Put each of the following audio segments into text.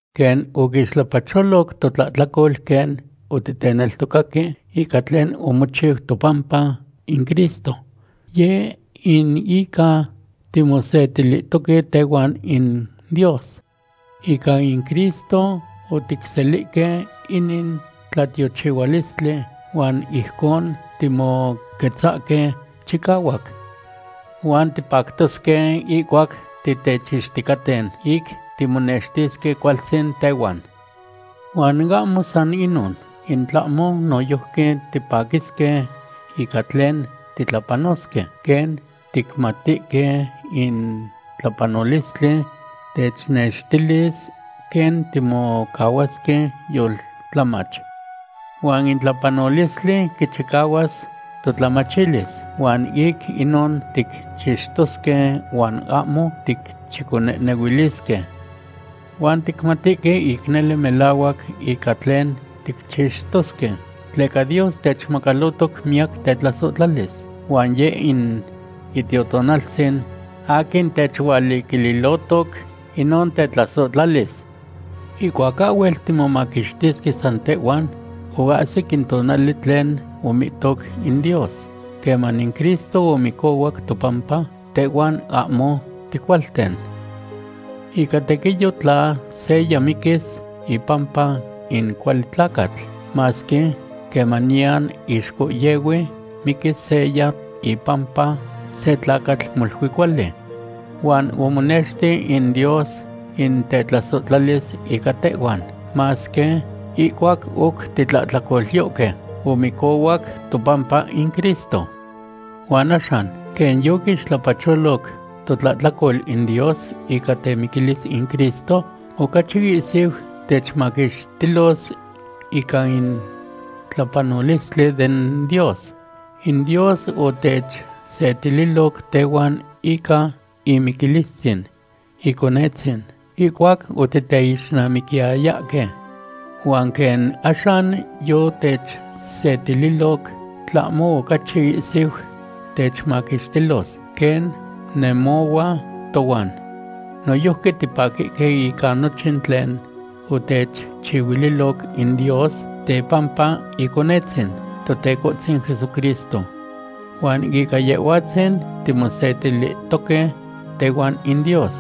Quen oquixtlapacholoc totlahtlacol quen oticneltocaque ica tlen omochiu topampa in Cristo, yeh in ica timosetilihtoque tehuan in Dios. Ica in Cristo oticselihque inin tlatiochihualistli huan ijcon timoquetzahque chicahuac. Huan tipactosque ihcuac titechixticaten ic timonextisque cualtzin tehuan. Huan ahmo san inon, in tlahmo noyojqui tipaquisque ica tlen titlapanosque, quen ticmatihque in tlapanolistli technextilis quen timocahuasque yoltlamach. Huan in tlapohpoluilistli quichicahuas totlamachilis huan ic inon ticchixtosque huan ahmo ticchiconehnehuilisque. Huan ticmatihque ic nele melahuac ica tlen ticchixtosque, tleca Dios techmacalotoc miyac tetlasohtlalis, huan Yeh in Itiotonaltzin aquin techualiquililohtoc inon tetlasohtlalis. Ihcuac ahhuel timomaquixtisque san tehhuan, oahsic in tonali tlen omihtoc in Dios, queman in Cristo omicohuac topampa tehhuan ahmo ticualten. Ica tequiyo tla seya miquis ipampa in cuali tlacatl, masque quemaniyan ixcohyehui miquis seya ipampa se tlacatl molui cuali. Huan omonexti in Dios in tetlasohtlalis ica tehhuan, masque ihcuac oc titlahtlacolyohque, omicohuac topampa in Cristo. Huan axan, quen yoquixtlapacholoc totlahtlacol in Dios ica temiquilis in Cristo, ocachi ihsiu techmaquixtilos ica in tlapanolistli den Dios. In Dios otechsetililoc tehuan ica imiquilistzin Iconetzin ihcuac otiteixnamiquiyayahque. Huan quen axan yotechsetililoc, tlahmo ocachi ihsiu techmaquixtilos, quen nemohua tohuan. Noyojqui tipaquihque ica nochin tlen otechchihuililoc in Dios tepampa Iconetzin, Totecohtzin Jesucristo. Huan ica Yehhuatzin timosetilihtoque tehuan in Dios.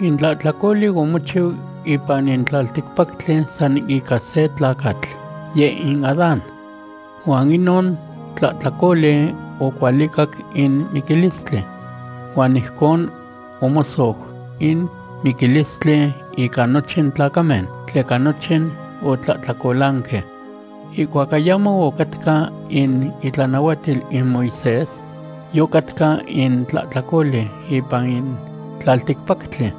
In tlahtlacoli omochiu ipan in tlalticpactli san ica se tlacatl, yeh in Adán. Huan inon tlahtlacoli ocualicac in miquilistli. Huan ijcon omosou in miquilistli ica nochin tlacamen, tleca nochin otlahtlacolanque. Ihcuac ayamo ocatca in itlanahuatil in Moisés, yocatca in tlahtlacoli ipan in tlalticpactli.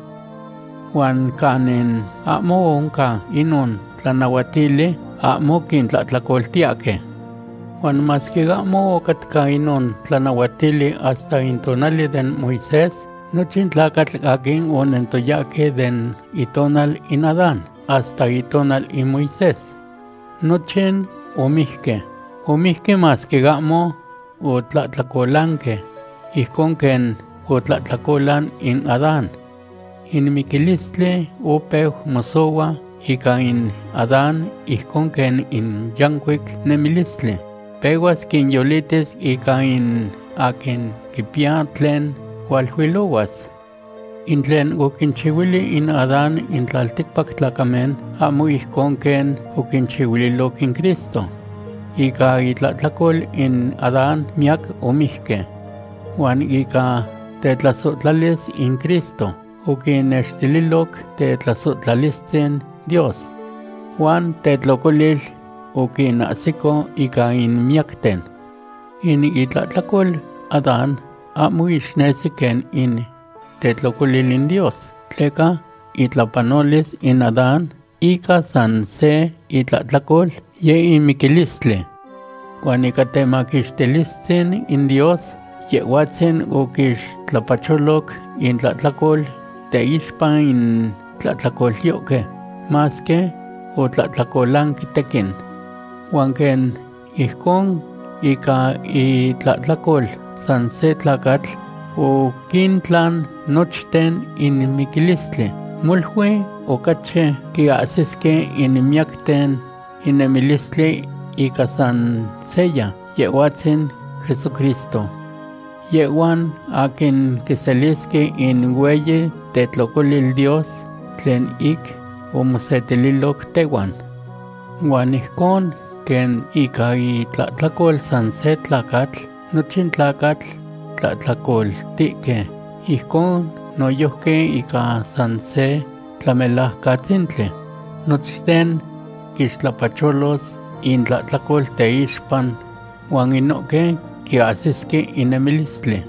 Huan canin ahmo oncan inon tlanahuatili, ahmo quintlahtlacoltiyahque. Huan masque ahmo ocatca inon tlanahuatili hasta in tonali den Moisés, nochin tlacatl aquin onentoyahque den itonal in Adán hasta itonal in Moisés, nochin omijque. Omijque masque ahmo otlahtlacolanque ijcon quen otlahtlacolan in Adán. In miquilistli opeu mosohua ica in Adán ijcon quen in yancuic nemilistli pehuas quinyolitis ica in aquin quipiya tlen hualuilohuas. In tlen oquinchihuili in Adán in tlalticpac tlacamen ahmo ijcon quen oquinchihuililoc in Cristo. Ica itlahtlacol in Adán miyac omijque. Huan ica tetlasohtlalis in Cristo, oquinnextililoc tetlasohtlalistzin Dios, huan tetlocolil oquinahsico ica in miyacten. In itlahtlacol Adán ahmo ixnesi quen in tetlocolil in Dios, tleca itlapanolis in Adán ica san se itlahtlacol, yeh in miquilistli. Huan ica temaquixtilistzin in Dios, Yehhuatzin oquixtlapacholoc intlahtlacol teixpa in tlahtlacolyohque, masque otlahtlacolanque tequin. Huan quen ijcon ica itlahtlacol san se tlacatl, oquintlan nochten in miquilistli, molui ocachi quiahsisque in miyacten in nemilistli ica san seya, Yehhuatzin Jesucristo. Yehhuan aquin quiselisque in hueyi tetlocolil Dios tlen ic omosetililoc tehuan. Huan ijcon quen ica itlahtlacol san se tlacatl, nochin tlacatl tlahtlacoltihque, ijcon noyojqui ica san se Tlamelajcatzintli, nochten quixtlapacholos intlahtlacol teixpa, huan inohque quiahsisque in nemilistli.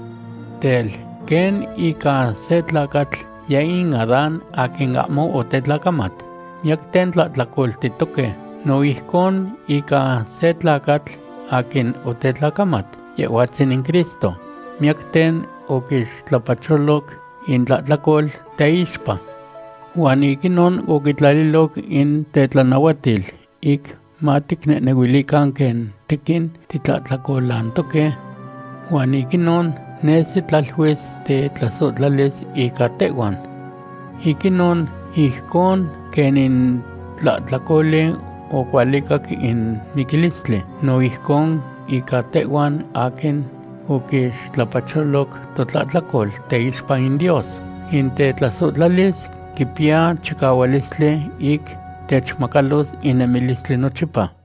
Tel, quen ica se tlacatl, yeh in Adán aquin ahmo otetlacamat, miyacten tlahtlacoltihtoque, no ijcon ica se tlacatl, aquin otetlacamat, Yehhuatzin in Cristo, miyacten oquixtlapacholoc intlahtlacol teixpa. Huan ic inon oquitlaliloc in tetlanahuatil ic maticnehnehuilican quen tequin titlahtlacolantoque. Huan ic inon nesi tlaluis tetlasohtlalis ica tehhuan. Ic inon, ijcon quen in tlahtlacoli ocualicac in miquilistli, no ijcon ica tehhuan aquin oquixtlapacholoc totlahtlacol teixpa in Dios, in tetlasohtlalis quipiya chicahualistli ic techmacalos in nemilistli nochipa.